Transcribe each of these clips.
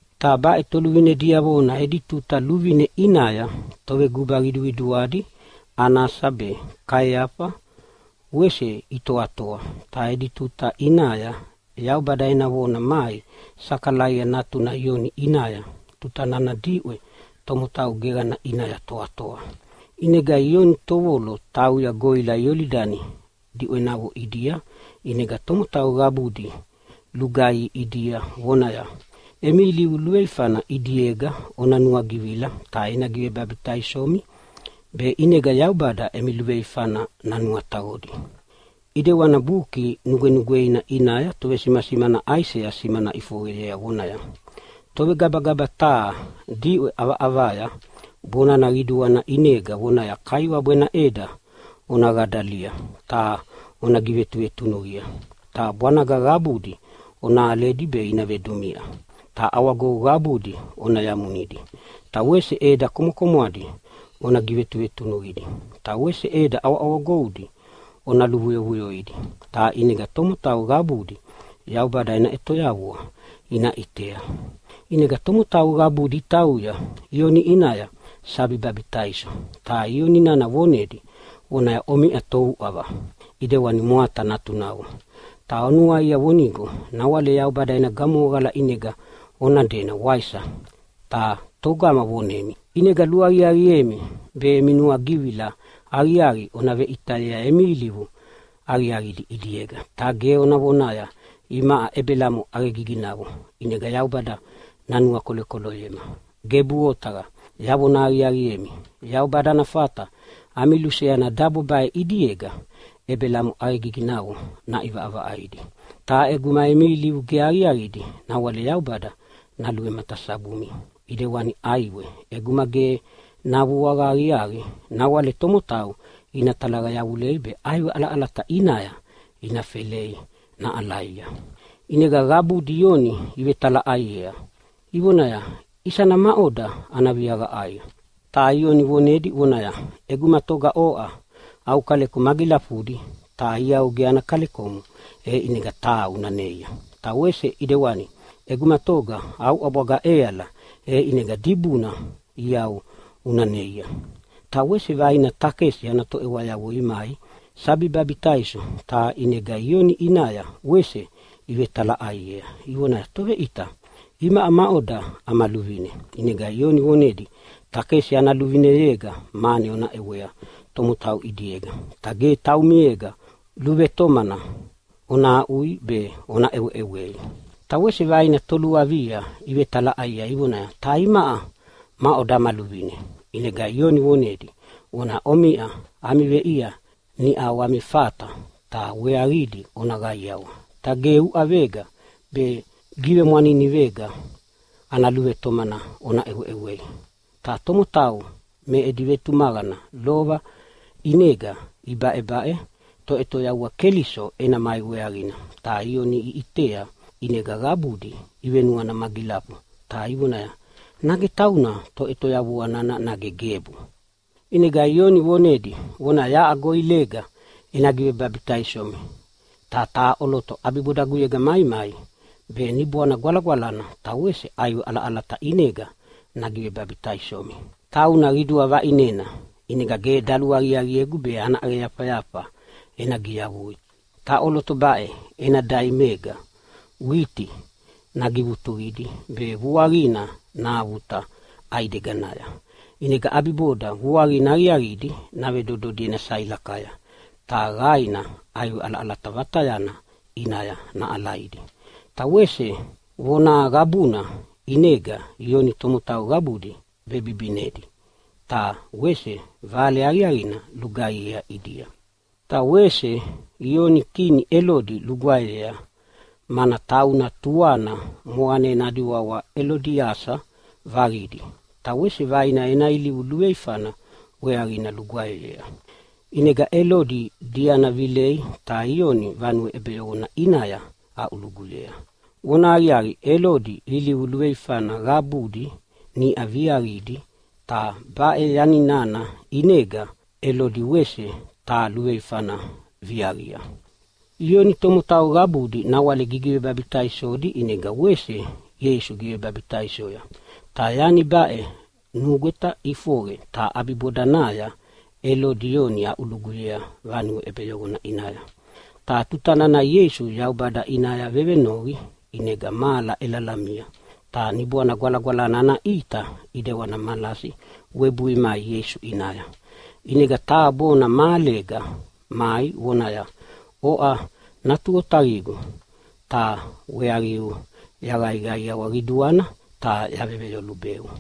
Ta baʼe toluvine diavona edi tuta luvine ʼinaya toveguba qiduqiduadi Anasa be Kaiafa wese itoatoa, ta edi tuta ʼinaya Yaubada ena vona mai Sakalaia natuna Ioni ʼinaya tuta nana diʼwe tomotau geqana ʼinaya toatoa. ʼInega Ioni tovolo tauya goʼila Iolidani diʼwenavo ʼidia ʼinega tomotau qabudi lugaihi ʼidia vonaya, “Emi ilivu luveifana ʼidiega ona nuagivila ta ena givebabitaisomi be ʼinega Yaubada emi luveifana nanuataqodi.” ʼIdewani Buki Nugwenugweina ʼinaya tovesimasimana Aisea simana ʼifoqeyea vonaya, “Tovegabagaba taha diʼwe ʼavaʼavaya bonana qiduana ʼinega vonaya, ‘Kaiwabu ena ʼeda ona qadalia ta ona givetuvetunuqia. Ta bwanaga qabudi ona aledi be ina vedumiʼa, ta ʼawagou qabudi ona yamunidi, ta wese ʼeda komwakomwadi ona givetunutunuqidi ta wese ʼeda ʼawaʼawagoudi ona luvuyovuyoidi. Ta ʼinega tomotau qabudi Yaubada ena ʼetoyavua ina ʼitea.’” ʼInega tomotau qabudi itauya Ioni ʼinaya sabi babitaiso ta Ioni nana vonedi vonaya, “Omiʼa touʼava ʼidewana mwata natunavo! Ta onuaia vonigo nawale Yaubada ena gamohoqala ʼinega ona dena, waisa? Ta togama vonemi? ʼInega luaqiaqiemi be emi nuagivila aqiaqi ona veʼitayea emi ilivu aqiaqidi ʼidiega, ta ge ona vonaya, ‘Imaʼa Ebelamo ʼaqegiginavo ʼinega Yaubada nanuakolokoloyema.’ Gebu otaqa! Yavona aqiaqiemi, Yaubada ana fata ami luseana dabo baʼe ʼidiega Ebelamo ʼaqegiginavo naʼivaʼavaʼaidi. Ta ʼeguma emi ilivu ge aqiaqidi nawale Yaubada naluvematasabumi ʼidewani ʼaiwe ʼeguma ge navuaqa aqiaqi nawale tomotau ina talaqa yavulei be ʼaiwe ʼalaʼalata ʼinaya ina felei naʼalaia.” ʼInega qabudi Ioni ivetalaʼaiea ivonaya, “Isana maʼoda ana viaqa ʼaiqa?” Ta Ioni vonedi vonaya, “ʼEguma toga oʼa au kaleko magilafudi ta iau ge ana kalekomo, e ʼinega taha una neia. Ta wese ʼidewani ʼeguma toga au ʼabwaga ʼeala e ʼinega dibuna iau una neia.” Ta wese vaina takesi ana toʼewayavo imai sabi babitaiso, ta ʼinega Ioni ʼinaya wese ivetalaʼaiea ivonaya, “Toveʼita, imaʼa maʼoda ama luvine?” ʼInega Ioni vonedia, “Takesi ana luvineyega mane ona ʼewea tomotau ʼidiega, ta ge taumiega luvetomana ona aʼui be ona ʼeweʼewei.” Ta wese vaina toluavia ivevetalaʼaiea ivonaya, “Ta imaʼa maʼoda ama luvine?” ʼInega Ioni vonedi vonaya, “Omiʼa ami veʼia niʼau ami fata ta weaqidi ona qaiawa. Ta ge uʼavega be givemwaninivega ana luvetomana ona ʼeweʼewei.” Ta tomotau me edi vetumaqana lova ʼinega ibaʼebaʼe Toʼetoyavua Keliso ena mai weaqina. Ta Ioni iʼitea ʼinega qabudi ivenuana magilafu ta ivonaya, “Nage tauna Toʼetoyavua nana nage gebu?” ʼInega Ioni vonedi vonaya, “Yaʼa goʼilega ena givebabitaisomi ta taha ʼoloto ʼabibodaguyega maimai be Niboana Gwalagwalana ta wese ʼaiwe ʼalaʼalata ʼinega nagivebabitaisomi. Tauna qidua vaʼinena, ʼinega ge daluaqiaqiegu be ana ʼaqeyafayafa ena giyavui. Ta ʼoloto baʼe ena daimayega witi nagivutuqidi be vuaqina nahavuta ʼaideganaya ʼinega ʼabiboda vuaqina aqiaqidi navedododi ena sailakaya, ta qainina ʼaiwe ʼalaʼalata vatayana ʼinaya naʼalaidi.” Ta wese vona qabuna ʼinega Ioni tomotau qabudi vebibinedi ta wese vale aqiaqina lugaihiea ʼidia. Ta wese Ioni kini Elodi lugwaeyea, mana tauna tuana moqanena adi wawa Elodiasa vaqidi. Ta wese vaina ena ilivu luveifana weaqina lugwaeyea. ʼInega Elodi diana vilei ta Ioni vanue ʼebeyoqona ʼinaya aʼuluguyea. Vonahaqiaqi, Elodi ilivu luveifana qabudi niʼa viaqidi, ta baʼe yani nana ʼinega Elodi wese taha luveifana viaqia. Ioni tomotau qabudi nawale gigivebabitaisodi, ʼinega wese Ieisu givebabitaisoya. Ta yani baʼe nugweta ʼifoqe ta ʼabibodanaya Elodi Ioni aʼuluguyea vanue ʼebeyoqona ʼinaya. Ta tuta nana Ieisu Yaubada ʼinaya vevenoqi ʼinega mahala ʼelalamia, ta Niboana Gwalagwalana ana ʼita ʼidewani malasi webui mai Ieisu ʼinaya. ʼInega taha bona mahalega mai vonaya, “Oʼa Natu Otaqigu, ta weaqiu yaqaiqaiawa qiduana ta yaveveyolubeu.”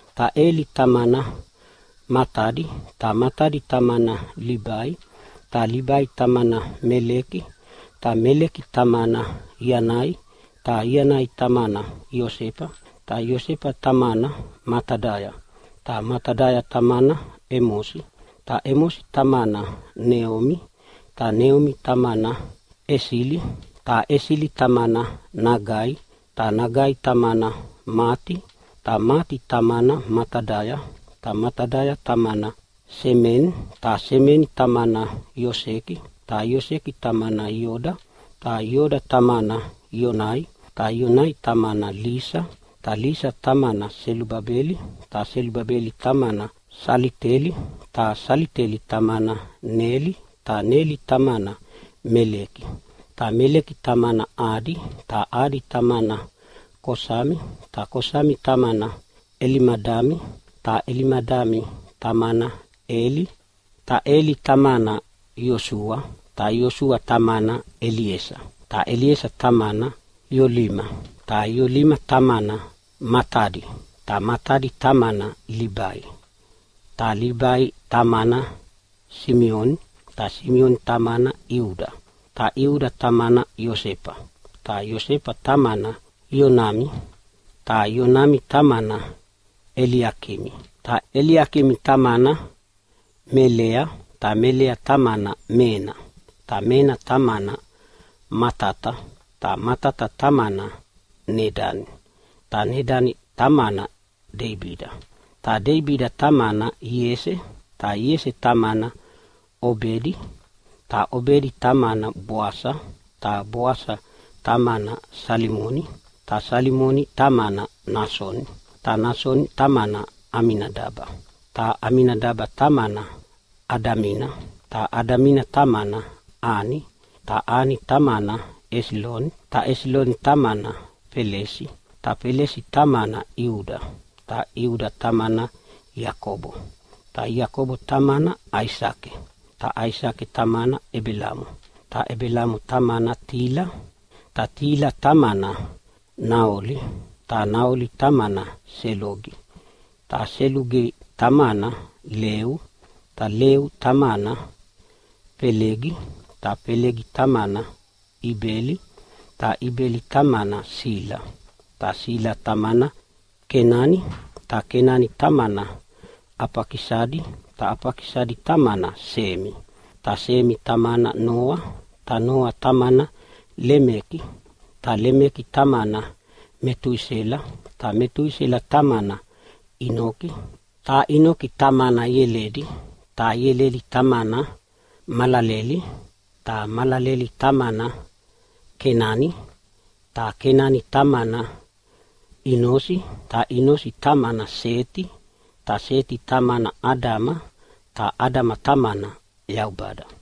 ta Eli tamana Matadi, ta Matadi tamana Libai, ta Libai tamana Meliki, ta Meliki tamana Ianai, ta Ianai tamana Iosefa, ta Iosefa tamana Matadaya, ta Matadaya tamana Emosi, ta Emosi tamana Neumi, ta Neumi tamana Esili, ta Esili tamana Nagai, ta Nagai tamana Mati, ta Mati tamana Matadaya, ta Matadaya tamana Semeni, ta Semeni tamana Ioseki, ta Ioseki tamana Ioda, ta Ioda tamana Ioanai, ta Ioanai tamana Lisa, ta Lisa tamana Selubabela, ta Selubabela tamana Salatieli, ta Salatieli tamana Neli, ta Neli tamana Meliki, ta Meliki tamana Adi, ta Adi tamana Kosami, ta Kosami tamana Elimadami, ta Elimadami tamana Eli, ta Eli tamana Iosua, ta Iosua tamana Eliesa, ta Eliesa tamana Iolima, ta Iolima tamana Matadi, ta Matadi tamana Libai, ta Libai tamana Simioni, ta Simioni tamana Iuda, ta Iuda tamana Iosefa, ta Iosefa tamana Ionami, ta Ionami tamana Eliakimi, ta Eliakimi tamana Melea, ta Melea tamana Mena, ta Mena tamana Matata, ta Matata tamana Nedani, ta Nedani tamana Deibida, ta Deibida tamana Iese, ta Iese tamana Obedi, ta Obedi tamana Boasa, ta Boasa tamana Salimoni, ta Salimoni tamana Nasoni, ta Nasoni tamana Aminadaba, ta Aminadaba tamana Adamina, ta Adamina tamana Ani, ta Ani tamana Esiloni, ta Esiloni tamana Felesi, ta Felesi tamana Iuda, ta Iuda tamana Iakobo, ta Iakobo tamana Aisake, ta Aisake tamana Ebelamo, ta Ebelamo tamana Tila, ta Tila tamana Naoli, ta Naoli tamana Selugi, ta Selugi tamana Leu, ta Leu tamana Felegi, ta Felegi tamana Ibeli, ta Ibeli tamana Sila, ta Sila tamana Kenani ta Kenani tamana Afakisadi, ta Afakisadi tamana Semi, ta Semi tamana Noa, ta Noa tamana Lemeki ta Lemeki tamana Metusela, ta Metusela tamana Inoki, ta Inoki tamana Ieledi, ta Ieledi tamana Malaleli, ta Malaleli tamana Kenani, ta Kenani tamana Inosi, ta Inosi tamana Seti, ta Seti tamana Adama, ta Adama tamana Yaubada.